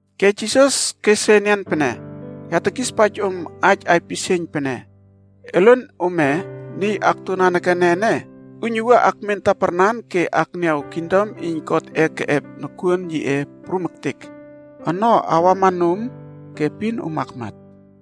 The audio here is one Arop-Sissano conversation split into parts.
Ke Jisas kes re enian pene, “Ya tekispaij om aij aipisieiyn pene, elen ome niy akto nanekene ene uiynuwua akmen taparnan ke akniaw kingdom iyn Godꞌe keꞌep nokuon yiꞌe prum ektek ono awama nom, ke epin om akmat.”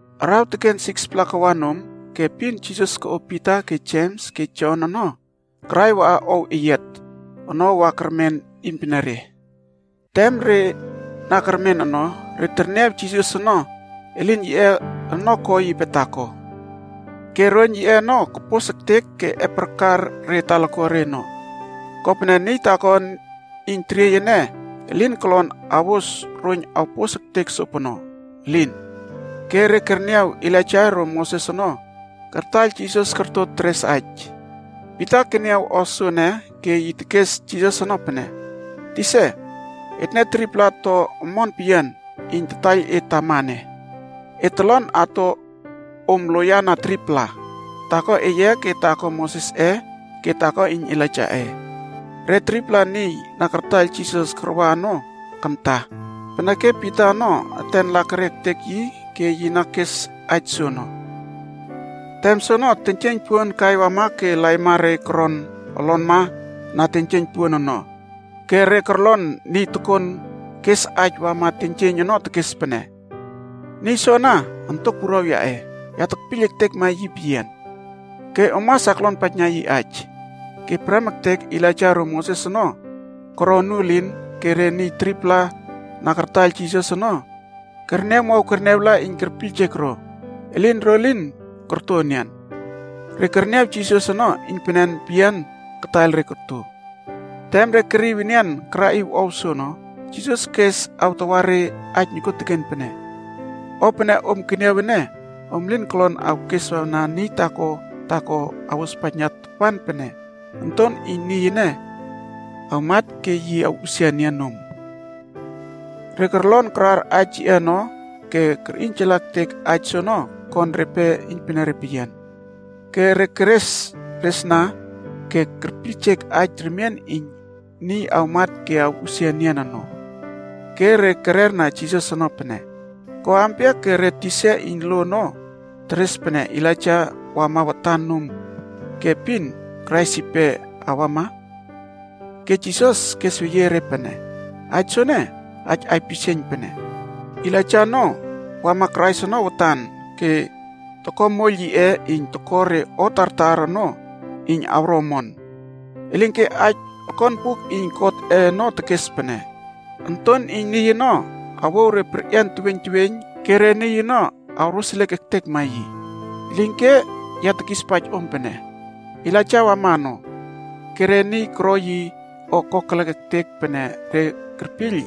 Araw teken 6-pla kawa nom, ke epin Jisas koꞌo Pita ke Jems ke Jon ono karai waꞌa ow eyiat ono wa kermen iynpenere. Tem re na kermen ono, re terniaw Jisas ono elin yiꞌe ono ko yipe taako. Ke roiyn yiꞌe ono kopos ektek ke eparkar re talakuare ono. Kopene niy taako iyn teriey ene, elin kolon awos roiyn awpos ektek sopono, elin. Ke re kerniaw Elaija ro Moses ono, kartaiyl Jisas korto ke teres aij. Pita keniaw o soene ke yi tekes Jisas ono pene, “Tisa, etne 3-pla to omon peyian iyn tataiyl e tama ene. Et tolon ato om loiyana 3-pla. Taako eye ke taako Mosesꞌe ke taako iyn Elaijaꞌe.” Re 3-pla niy na kartaiyl Jisas karwa ono kamta, peneke Pita ono eten lakerie ektek yi ke yi na kes aij soono. Tem soono, teiynjieiyn puon kai wama ke laima re koron olonma na teiynjieiyn puon ono ke re korlon niy tokon kes aij wama teiynjieiyn ono tekes pene, “Niy soana, Ontok Wuruaw yaꞌe! Ya tekpiyl ektekma yi peyian. Ke om mas aklonpaijna yi aij.” Ke prem ektek Elaija ro Moses ono koro onuelin ke re niy 3-pla na kartaiyl Jisas ono kerniawmow kerniawla iyn kerpiyljek ro, elin ro lin korto enian. Re kerniaw Jisas ono iynpenen peyian kataiyl re koto. Tem re keriw enian karaꞌiw ow soono, Jisas kes awtawa re aij nokuoteken pene, “O pene om keniaw ene, om elin kolon awkesna niy taako taako awospaijna tapan pene Onton iyn Niy ene awmat ke yi awꞌusia enian nom.” Re korlon karar aij yiꞌe ono ke kerꞌiynjala ektek aij soono kon repe iynpenere peyian. Ke re keresresna ke kerpiyljek aij remien iyn “niy awmat ke awꞌusia enian” ono. Ke re kererna Jisas ono pene, “Ko ampia ke re tisa iyn lo ono teres pene Elaija awama watan nom ke epin Krais yipe awama?” Ke Jisas kesweyie re pene, “Aij soene, aij aipisieiyn pene: Elaija ono wama Krais ono watan ke toko moiyl yiꞌe iyn toko re o tartar ono iyn awro omon. Elinke aij okon Buk iyn God ono tekes pene Onton iyn Niy ono awouw re perꞌian teweiyn teweiyn ke re niy ono awroseliek ektekma yi. Elinke ya tekispaij om pene, Elaijaa wama ono, ke re niy koro yi o kokelek ektek pene re kerpiyl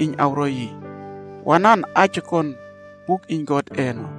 iyn awro yi, wanan aij okon buk iyn Godꞌe ono.”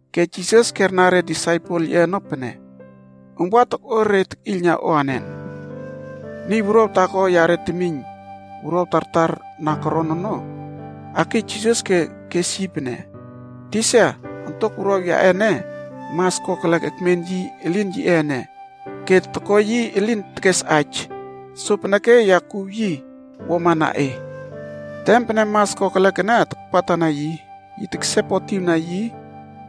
Ke Jisas kerna re disaipel yiꞌe ono pene, “Om wa tokꞌo re tekꞌiylna o anen?” Niy wuruaw taako yare temiyn wuruaw tartar na koron ono, akiy Jisas ke kes yi pene, “Tisa, ontok wuruaw yaꞌe ene mas kokelek ekmen yi elin yiꞌe ene ke toko yi elin tekes aij. Sopeneke ya kuw yi wuama na e. Tem pene mas kokelek ene takpatana yi, yi teksepotiwna yi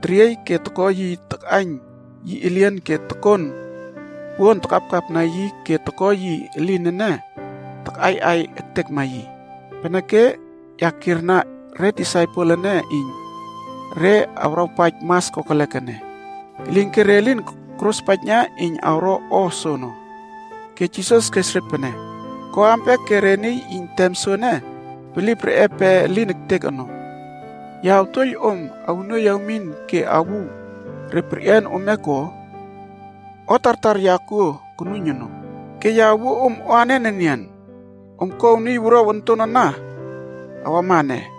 teriey ke toko yi takꞌaiyn yi elien ke tokon puon takapkapna yi ke toko yi elin ene takꞌaiꞌai ektekma yi. Peneke ya kierna re disaipel eye ene iyn re awrawpaij mas kokelek ene, elinke re lin korospaijna iyn awro o soono.” Ke Jisas kes re pene, “Ko ampia ke re niy iyn tem soene, bilip reꞌe pe elin ektek ono! Ya awtuoiyl om awnuoiy awmin ke awuw re perꞌian ome ko? O tartar ya kuo konuiyn ono, ke ya awuo om o anen enian? Om kouw niy wuruaw onton ana awama ene.”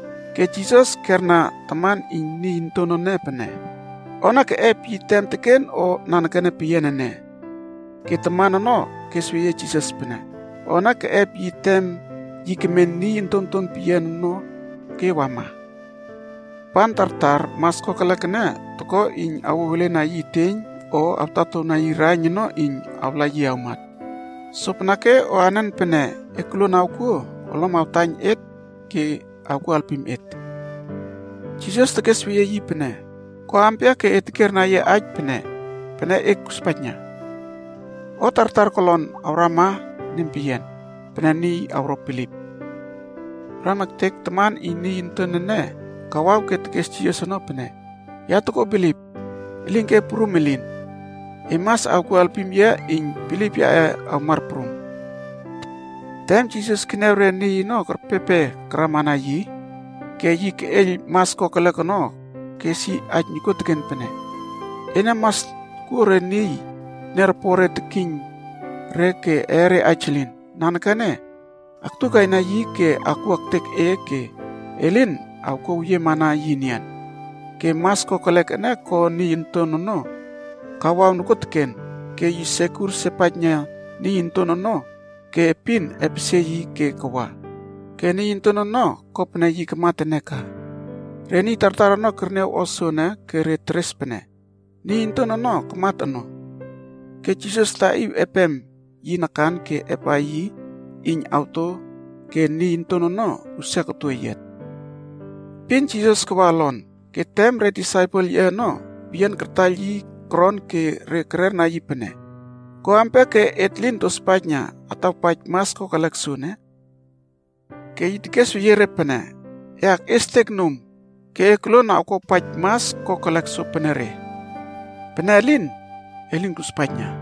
Ke Jisas kerna taman iyn niy onton ene pene, “O ene keꞌep yi tem teken o nanekene peyian ene?” Ke taman ono kesweyie Jisas pene, “O ene keꞌep yi tem yi kemen niy ontonton peyian ono ke wama. Tapan tartar mas kokelek ene toko iyn awouw elena yi eteiyn o awtatowna yi raiyn ono iyn awla yi awmat. Sopeneke o anen pene e koluon awkuo, olom awtaiyn et ke awkuo alpim et.” Jisas tekesweyie yi pene, “Ko ampia ke e tekierna yia aij pene ‘Pene e kuspaijna’? O tartar kolon awrama nempeyian, pene niy awro bilip.” Prem ektek, taman iyn niy onton ene kawaw ke tekes Jisas ono pene, “Ya toko bilip, elinke prum elin. E mas awkuo alpim yia iyn bilip yaꞌe awmar prum.” Tem Jisas keniaw re niy ono kerpepe karamana yi ke yi keꞌeiyl mas kokelek ono kes yi aij nokuoteken pene, “Ena mas tokuo re niy teniaropore tekiyn re ke eere aij elin. Nanekene aktukaina yi ke akwua ektek e ke elin awkuaweyiema na yi enian.” Ke mas kokelek ene ko niy onton ono kawaw nokuoteken, ke yi sekur sepaijna niy onton ono ke epin epesie yi ke kawa. Ke niy onton ono, ko pene yi kamat ene ka. Re niy tartar ono kerniaw o soene ke re teres pene, “Niy onton ono kamat ono.” Ke Jisas taꞌiw epem yi nakan ke epꞌa yi iyn awto ke niy onton ono usia koto eyiat. Epin Jisas kawa olon, ke tem re disaipel yiꞌe ono peyian kartaiyl yi koron ke re kererna yi pene, “Ko ampia ke et lin tospaijna atawpaij mas kokelek soene?” Ke yi tekesweyie re pene, “E akꞌiestek nom, ke e koluon awkuawpaij mas kokelek sopenere. Pene elin, e lin kuspaijna.”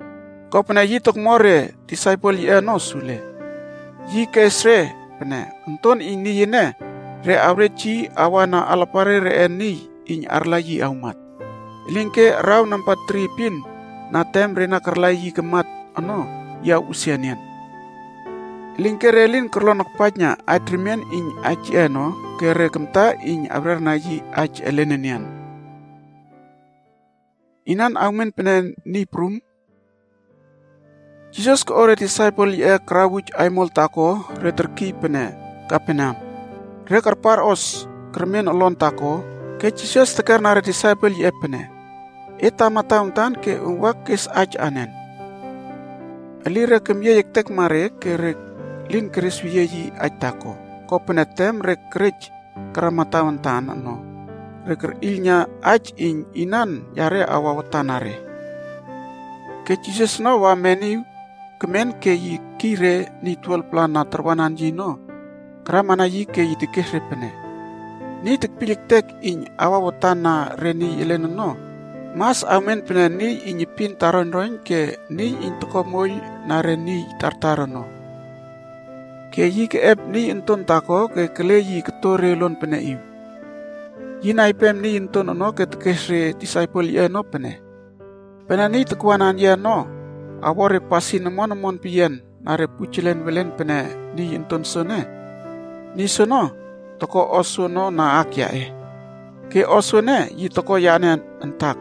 kopene yi tokmo re disaipel yiꞌe ono sule. Yi kes re pene, “Onton iyn Niy ene, re awrej yi awana alapare reꞌe niy iyn arla yi awmat. Elinke araw namba tri epin na tem re na karla yi kamat ono, yi awꞌusia enian.” Elinke re lin korlon akpaijna aij remien iyn aij yiꞌe ono ke re kamta iyn awrerna yi aij elen enian. Inan awmen pene niy prum? Jisas koꞌo re disaipel yiꞌe karawuj aimol taako re terkiy pene Kaperneam. Re karparꞌos kermen olon taako, ke Jisas tekerna re disaipel yiꞌe pene, “Et tama tawantan ke om wa kesna aij en?” Elire kemyiey ektekma re ke re lin keresweyie yi aij taako. Kopene tem re kerej karama tawantan ono, re kerꞌiylna aij iyn inan yare awa watan na re. Ke Jisas ono wa meniw kemen ke yi kekiy re niy 12-pla na tarwanan yi ono karamana yi ke yi tekes re pene, “Niy tekpiyl ektek iyn awa watan na re niy elen ono, mas awmen pene niy iyn epin taroiynroiyn ke niy iyn toko moiyl na re niy tartar ono.” Ke yi keꞌep niy onton taako ke yi kele yi koto re uluan peneꞌiw. Yi naipem niy onton ono ke tekes re disaipel yiꞌe ono pene, “Pene niy takwanan yia ono awo re pasin omon omon peyian na re pujelen welen pene niy onton soene, niy soono, toko o soono na aak yaꞌe. Ke o soene yi toko yane antak.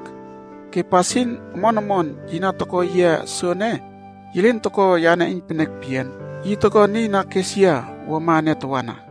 Ke pasin omon omon yi na toko yia soene, yi lin toko yane iynpenek peyian, yi toko niy na kes yia wuama ene tawana.”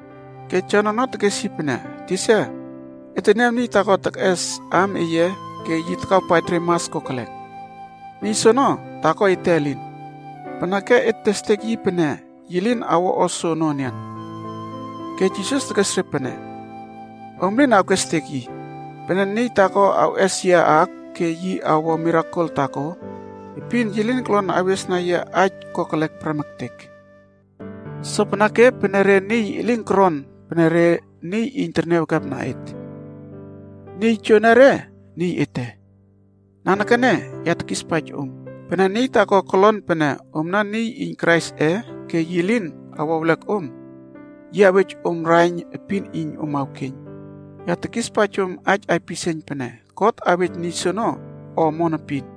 Ke Jon ono tekes yi pene, “Tisa, et teniaw niy taako tekꞌes aam eye ke yi takawpaij re mas kokelek. Niy soono, taako ete elin, peneke et testek yi pene yi lin awo o soono enian.” Ke Jisas tekes re pene, “Om elin awkestek yi. Pene niy taako awꞌes yia aak ke yi awo mirakel taako, epin, yi lin kolon awes na yia aij kokelek prem ektek. Sopeneke, pene re niy elin koron pene re niy iyn terniawekepna et, niy joenere, niy ete. Nanekene ya tekispaij om, pene niy taako kolon pene omna niy iyn Kraisꞌe ke yi lin awo ewlek om, yi awej om raiyn epin iyn om awkeiyn, ya tekispaij om aij aipisieiyn pene, God awej niy soono o omon epin.”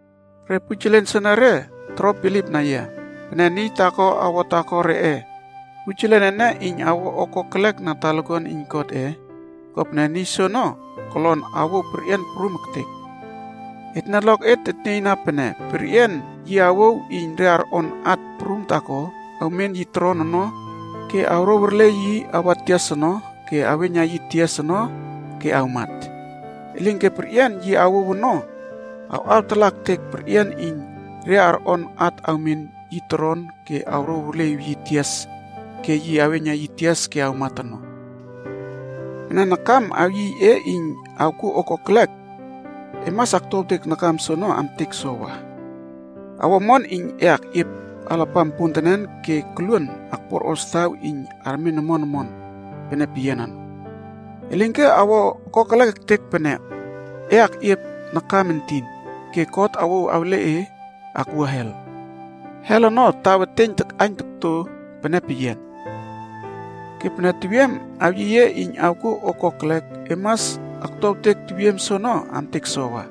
“Re pujelen soenere toro bilipna yia. Pene niy taako awo taako reꞌe pujelen ene iyn awo o kokelek na talakuan iyn Godꞌe, kopene niy soono kolon awouw perꞌian prum ektek. Etne oloket tetnieyna pene perꞌian yi awouw iyn re arꞌon at prum taako awmen yi toron ono ke awrouw arle yi awa tias ono ke aweiyna yi tias ono ke awmat. Elinke perꞌian yi awouw ono awꞌawtalaꞌa ektek perꞌian iyn re arꞌon at awmen yi toron ke awrouw arleꞌiw yi tias ke yi aweiyna yi tias ke awmat ono. Pene nakam awyiy e iyn awkuo o kokelek, e mas aktuawtek nakam soono amtek sowa. Awo omon iyn e akꞌiep alapam pontenen ke e koluon akpuarꞌos taw iyn armen omon omon pene peyian ono. Elinke, awo kokelek ektek pene e akꞌiep nakam entin, ke God awouw awle e akwua hel. Hel ono taw eteiyn takꞌaiyn okto pene peyian. Ke pene tewiem awyiy e iyn awkuo o kokelek, e mas aktuawtek tewiem soono amtek sowa.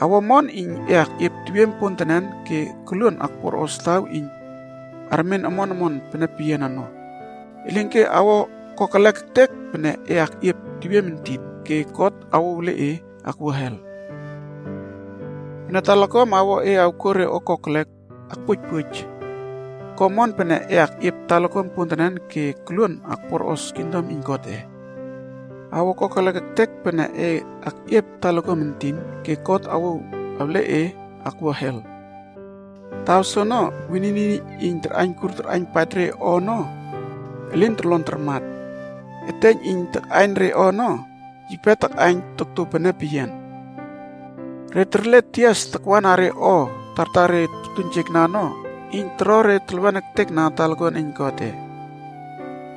Awo omon iyn e akꞌiep tewiem pontenen ke e koluon akpuarꞌos taw iyn armen omon omon pene peyian ono. Elinke awo kokelek ektek pene e akꞌiep tewiem entin, ke God awouw awle e akwua hel. Pene talakuam awo e awkuo re o kokelek, akpuoijpuoij. Ko omon pene e akꞌiep talakuam pontenen ke e koluon akpuarꞌos kingdom iyn Godꞌe. Awo kokelek ektek pene e akꞌiep talakuam entin, ke God awouw awle e akwua hel. Taw soono, ‘wenini iyn tarꞌaiynkur tarꞌaiynpaij re o ono, elin torlon tarmat. Eteiyn iyn takꞌaiyn re ono, yipe takꞌaiyn tokto pene peyian.’ “Re terle tias takwana re o tartar re tortuiynjekna ono iyn toro re telwen ektekna talakuan iyn Godꞌe.b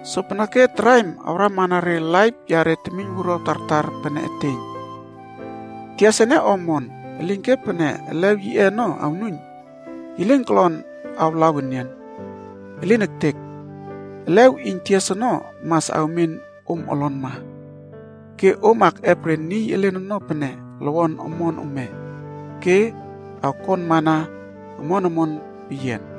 Sopeneke traim awrama na laip yare temiynwuruaw tartar pene eteiyn. “Tias ene o omon, elinke pene elew yiꞌe ono awnuiyn, yi lin kolon awalaw enian. Elin ektek! Elew iyn tias ono mas awmen om olonma, ke om akꞌep re niy elen ono pene lowon omon ome ke awkonmana omon omon peyian.”